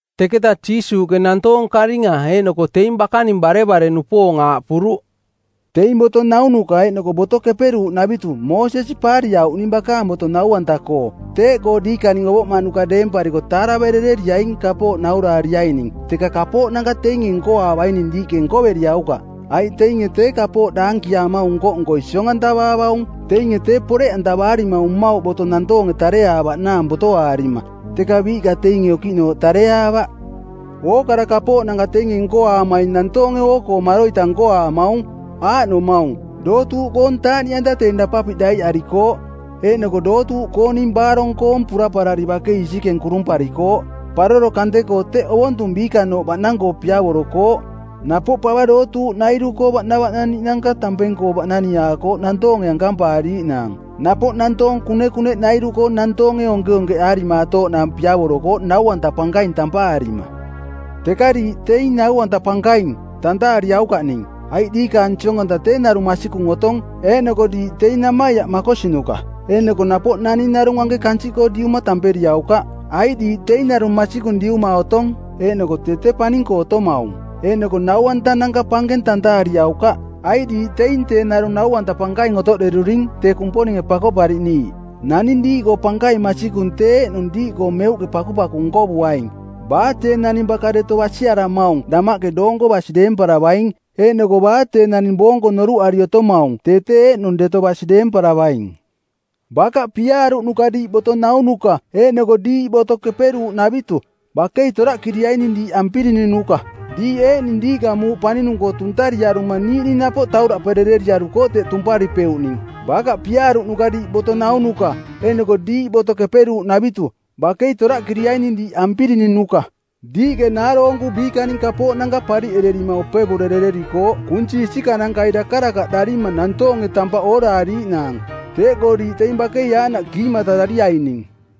Teketa Jiisuuꞌke nantoong karinga eeꞌnoko teing bakaning barevare-nupoong aaꞌpuruꞌ, “Teing boto naunuka eeꞌnoko Boto Keperuuꞌnavitu Moosesi paariauꞌning bakaang boto nau-anta-koo. Teeꞌkoo diikaning ovoꞌmaꞌnuka deempariko taaraverereriaing kapooꞌ nauraariaining, teka kapooꞌnanka teinge nkoaavaining diiꞌke nkoveriaukaꞌ, aiꞌ teinge tee kapooꞌ daankiaamaung nko-nkoi siong-antavaavaung. Teinge tee poreꞌantavaarimaung mmauꞌ boto nantoonge tareaavaꞌnaang botoaarima, teka biiꞌka teinge okiꞌnooꞌ tareaavaꞌ. “Ookara kapooꞌnanka teinge nkoaamaing nantoonge oo-koo maroita nkoaamaung. Aaꞌnomaung: dootuuꞌkoong taaꞌniꞌanta teing dapapiꞌ daiꞌarikooꞌ, eeꞌnoko dootuuꞌkooning baarong-koong puraparari bakei isikeng kurumparikooꞌ. Paroro kante-koo teꞌ ovontung biikanooꞌ baꞌnang-koo piavorokooꞌ. Napoꞌ pava dootuuꞌnairu-koo baꞌnavaꞌnaniꞌnanka tampeng-koo baꞌnaniaakooꞌ nantoonge ankampaariaꞌnaang. Napoꞌ nantoong kunekuneꞌnairu-koo nantoonge onkeonkeꞌaarimaatooꞌnaang piavorokooꞌ ‘Nau-anta Pankaing’ tampaarima. Teka diiꞌ teing ‘Nau-anta Pankaing!’ tantaariaukaꞌning, aiꞌ diikaang Siong-anta tee narung masikung otong, eeꞌnoko diiꞌ teing namaiaꞌ makosinuka. Eeꞌnoko napoꞌ naning narung anke kansiꞌkoo diuma tamperiaukaꞌ, aiꞌ diiꞌ teing narung masikung Diuma otong, eeꞌnoko tee tee paning-koo otomaung. Eeꞌnoko nau-antananka pankeng tantaariaukaꞌ, aiꞌ diiꞌ teing tee narung Nau-anta Pankaing otoꞌderuring tee Kumponinge Pakoꞌpariꞌniiꞌ. Naning diiꞌkoo pankaing masikung tee eeꞌnung diiꞌkoo meuꞌke pakupaku nkovuaing. Baa tee naning baka deto basiaramaung damaꞌke doonko basi deemparavaing, eeꞌnoko baa tee naning boonko noruꞌari otomaung tee tee eeꞌnung deto basi deemparavaing. Bakaꞌ piaaruꞌnuka diiꞌ boto naunuka eeꞌnoko diiꞌ Boto Keperuuꞌnavitu, bakei toraꞌkiriaining diiꞌ ampirinunuka. Diiꞌ eeꞌning diiꞌka muuꞌ paninung-koo tuntariaruma niiꞌning napoꞌ tauraꞌperereriarukooꞌ teꞌ tumparipeuꞌning. Bakaꞌ piaaruꞌnuka diiꞌ boto naunuka eeꞌnoko diiꞌ Boto Keperuuꞌnavitu, bakei toraꞌkiriaining diiꞌ ampirinunuka. Diiꞌke naaroonku biikaning kapooꞌnanka pariꞌererima opevurerererikooꞌ kunsi isikanankai dakarakaꞌdarima nantoonge tampaꞌ ooraariiꞌnaang. Teeꞌkoo diiꞌ teing bakei aaꞌnaꞌ kiimatarariaining.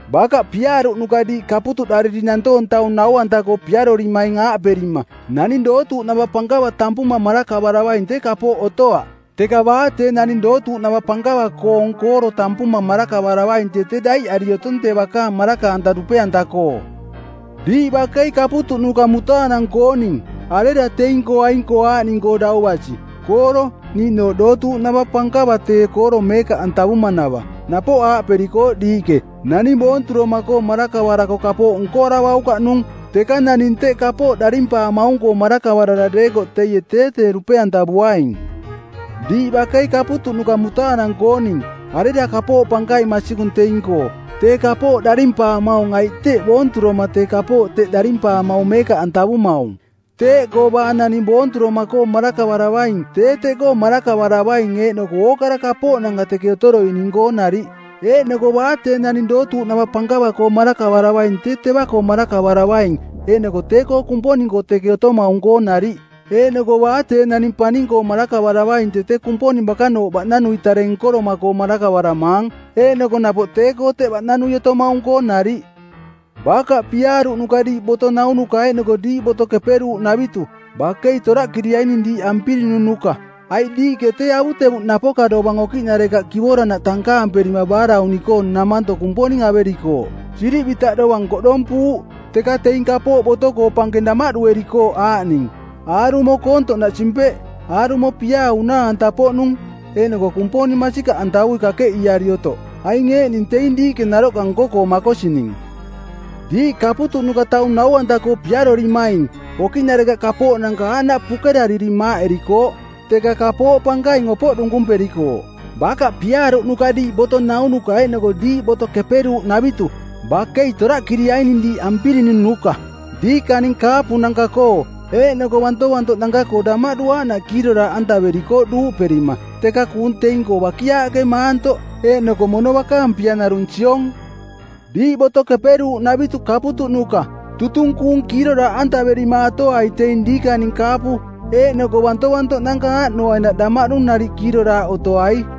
Bakaꞌ piaaruꞌnuka diiꞌ kaputuꞌdariri nantoong taung nau-anta-koo piarorimaing aaꞌperima, ‘Naning dootuuꞌnava pankava tampuma marakavaravaing tee kapooꞌ otoaꞌ, teka baa tee naning dootuuꞌnava pankava-koong kooro tampuma marakavaravaing tee tee daiꞌari otong tee bakaang maraka-anta dupe-anta-koo.’ Diiꞌ bakei kaputuꞌnuka mutaanang-kooning, arera teing-koo aing-koo aaꞌning-koo dau basi: kooro niiꞌnooꞌ dootuuꞌnava pankava tee kooro meekaꞌantavumanava? Napoꞌ aaꞌperikooꞌ diiꞌke, ‘Naning boonturoma-koo marakavarako kapooꞌ nkoaravaukaꞌnung, teka naning teꞌ kapooꞌ darimpaamaung-koo marakavarara deekoꞌ teie tee tee dupe-antavuaing.’ Diiꞌ bakei kaputuꞌnuka mutaanang-kooning, arera kapooꞌ pankaing masikung teing-koo, tee kapooꞌ darimpaamaung aiꞌ teꞌ boonturoma tee kapooꞌ teꞌ darimpaamaung meekaꞌantavumaung? Teeꞌkoo baa naning boonturoma-koo marakavaravaing tee teꞌkoo marakavaravaing eeꞌnoko ookara kapooꞌnanka teke otoroining-koo nariꞌ. Eeꞌnoko baa tee naning dootuuꞌnava pankava-koo marakavaravaing tee teva-koo marakavaravaing eeꞌnoko tee-koo Kumponing-koo teke otomaung-koo nariꞌ. Eeꞌnoko baa tee naning paning-koo marakavaravaing tee tee Kumponing bakanooꞌ baꞌnanui tare nkoroma-koo marakavaramaang eeꞌnoko napoꞌ tee-koo teꞌ baꞌnanui otomaung-koo nariꞌ. “Bakaꞌ piaaruꞌnuka diiꞌ boto naunuka eeꞌnoko diiꞌ Boto Keperuuꞌnavitu, bakei toraꞌkiriaining diiꞌ ampirinunuka, aiꞌ diiꞌke tee avutevuꞌ napoka dovang okiꞌnarekaꞌ kivoranaꞌ tankaamperima baarauni-koo˜ namanto Kumponing averikooꞌ, sirivitaꞌ dovang koꞌdompuuꞌ, teka teing kapooꞌ boto-koo pankeng damaꞌduerikooꞌ aaꞌning: aarumo koontoꞌnaꞌ simpeꞌ, aarumo piaa unaa-anta-poꞌnung, eeꞌnoko Kumponing masikaꞌantavui kakeꞌiiari otoꞌ. Aing eeꞌning teing diiꞌke naroꞌka nko-koo makosining. Diiꞌ kaputuꞌnuka taung nau-anta-koo piarorimaing, okiꞌnarekaꞌ kapooꞌnanka aaꞌnaꞌ pukerariri maaꞌerikooꞌ, teka kapooꞌ pankaing opoꞌ dunkumperikooꞌ. Bakaꞌ piaaruꞌnuka diiꞌ boto naunuka eeꞌnoko diiꞌ Boto Keperuuꞌnavitu, bakei toraꞌkiriaining diiꞌ ampirinunuka˜. Diikaning kaapunanka-koo eeꞌnoko bantovantoꞌnanka-koo damaꞌdu aaꞌnaꞌ kiiroraaꞌantaverikooꞌ duuꞌperima, teka kuung teing-koo bakiaaꞌke maantoꞌ, eeꞌnoko mono bakaang pia narung siong. Diiꞌ Boto Keperuuꞌnavitu kaputuꞌnuka, tutung kuung kiiroraaꞌantaverimaatoai teing diikaning kaapu eeꞌnoko bantovantoꞌnanka aaꞌnoainaꞌ damaꞌdu nariꞌ kiiroraaꞌ otoai.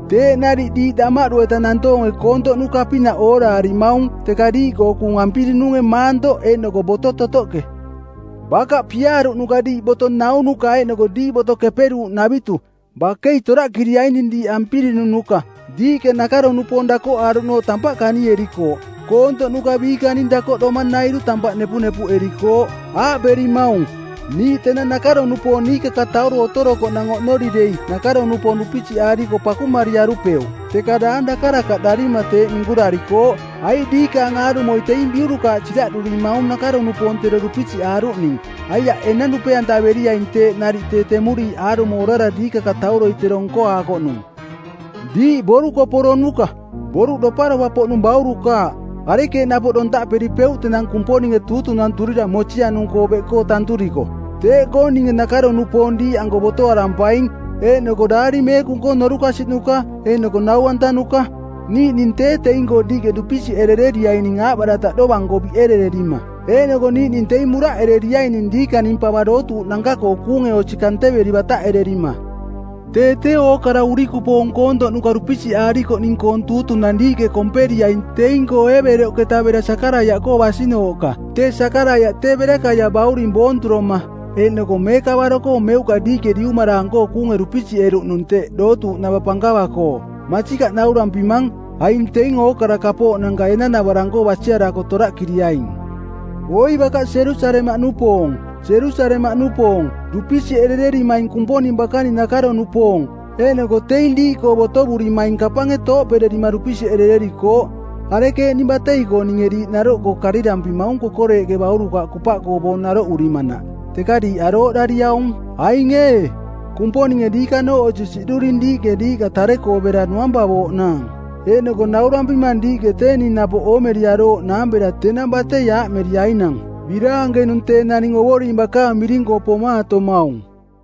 Teeꞌ nariꞌ diiꞌ damaꞌdu-eta nantoonge koontoꞌnuka-pinaꞌ ooraarimaung teka diiꞌkoo kuung ampirinunge˜ maantoꞌ eeꞌnoko boto totoꞌke. “Bakaꞌ piaaruꞌnuka diiꞌ boto naunuka eeꞌnoko diiꞌ Boto Keperuuꞌnavitu, bakei toraꞌkiriaining diiꞌ ampirinunuka. Diiꞌke nakaro-nupoong dakoꞌaaruꞌnooꞌ tampaꞌ kanierikooꞌ, koontoꞌnuka biikaning dakoꞌdomanairu tampaꞌ nepunepuꞌerikooꞌ. Aaꞌperimaung, ‘Niiꞌ tenang nakaro-nupoong niikakatauro otorokoꞌnang oꞌnori dei nakaro-nupoong dupisiꞌaariko pakumariarupeuꞌ.’ Teka daang dakarakaꞌdarima teeꞌ minkurarikooꞌ, aiꞌ diikaang aarumoi teing biurukaaꞌ siraꞌdurimaung nakaro-nupoong tero dupisiꞌaaruꞌning. Aiaꞌ enang dupe-antaveriaing teeꞌ nariꞌ tee temuriiꞌ aarumo orara diikakatauroi tero nkoaakoꞌnung. Diiꞌ borukoporonuka, boruꞌ doparopa-poꞌnung baurukaaꞌ, arekeeꞌ napoꞌ dontaꞌperipeuꞌ tenang Kumponinge tuutunanturira mosianung-koo beꞌkoo tanturiko? “Teeꞌkoo ninge nakaro-nupoong diiꞌanko botoarampaing eeꞌnoko Daari Meekung-koo norukasiꞌnuka eeꞌnoko nau-antanuka. Niiꞌning tee teing-koo diiꞌke dupisiꞌerereriaining aaꞌbarataꞌ dovang-koo biꞌerererima. Eeꞌnoko niiꞌning teing muraꞌereriaining diikaning pava dootuuꞌnanka-koo kuunge osi kanteveri bataꞌererima. Tee tee ookara urikupoong koontoꞌnuka dupisiꞌaarikoꞌning-koong tuutunang diiꞌke komperiaing teing-koo Eebeloꞌketa bera Sakaraiaꞌkoo basinooꞌka, tee Sakaraiaꞌ tee Berakaia bauring boonturoma eeꞌnoko meekavaro-koo meuꞌka diiꞌke diumaraang-koo kuunge dupisiꞌeruꞌnung teꞌ dootuuꞌnava pankava-koo. Masikaꞌ naurampimang, aing teing ookara kapooꞌnanka enanavarang-koo basiarako toraꞌkiriaing.” “Oi bakaꞌ Jerusalemaꞌnupoong, Jerusalemaꞌnupoong, dupisiꞌerererimaing Kumponing bakaning nakaro-nupoong, eeꞌnoko teing diiꞌkoo botovurimaing kapange tooꞌpererima dupisiꞌerererikooꞌ, arekeeꞌning batei-koo ninge diiꞌ naroꞌkoo karirampimaung kokoreeꞌke baurukaaꞌ kupaꞌkoo boong naroꞌurimanaꞌ, teka diiꞌ arooꞌdariaung. Aing ee, Kumponinge diikanooꞌ osi siꞌduring diiꞌke diiꞌka tare-koo bera nuampavooꞌnaang. Eeꞌnoko naurampimang diiꞌke tee ning napoꞌ oomeriarooꞌnaang bera tenang batei aaꞌmeriainang, ‘Biraankenung tee naning Ovoring bakaang miring-koo pomaatomaung.’”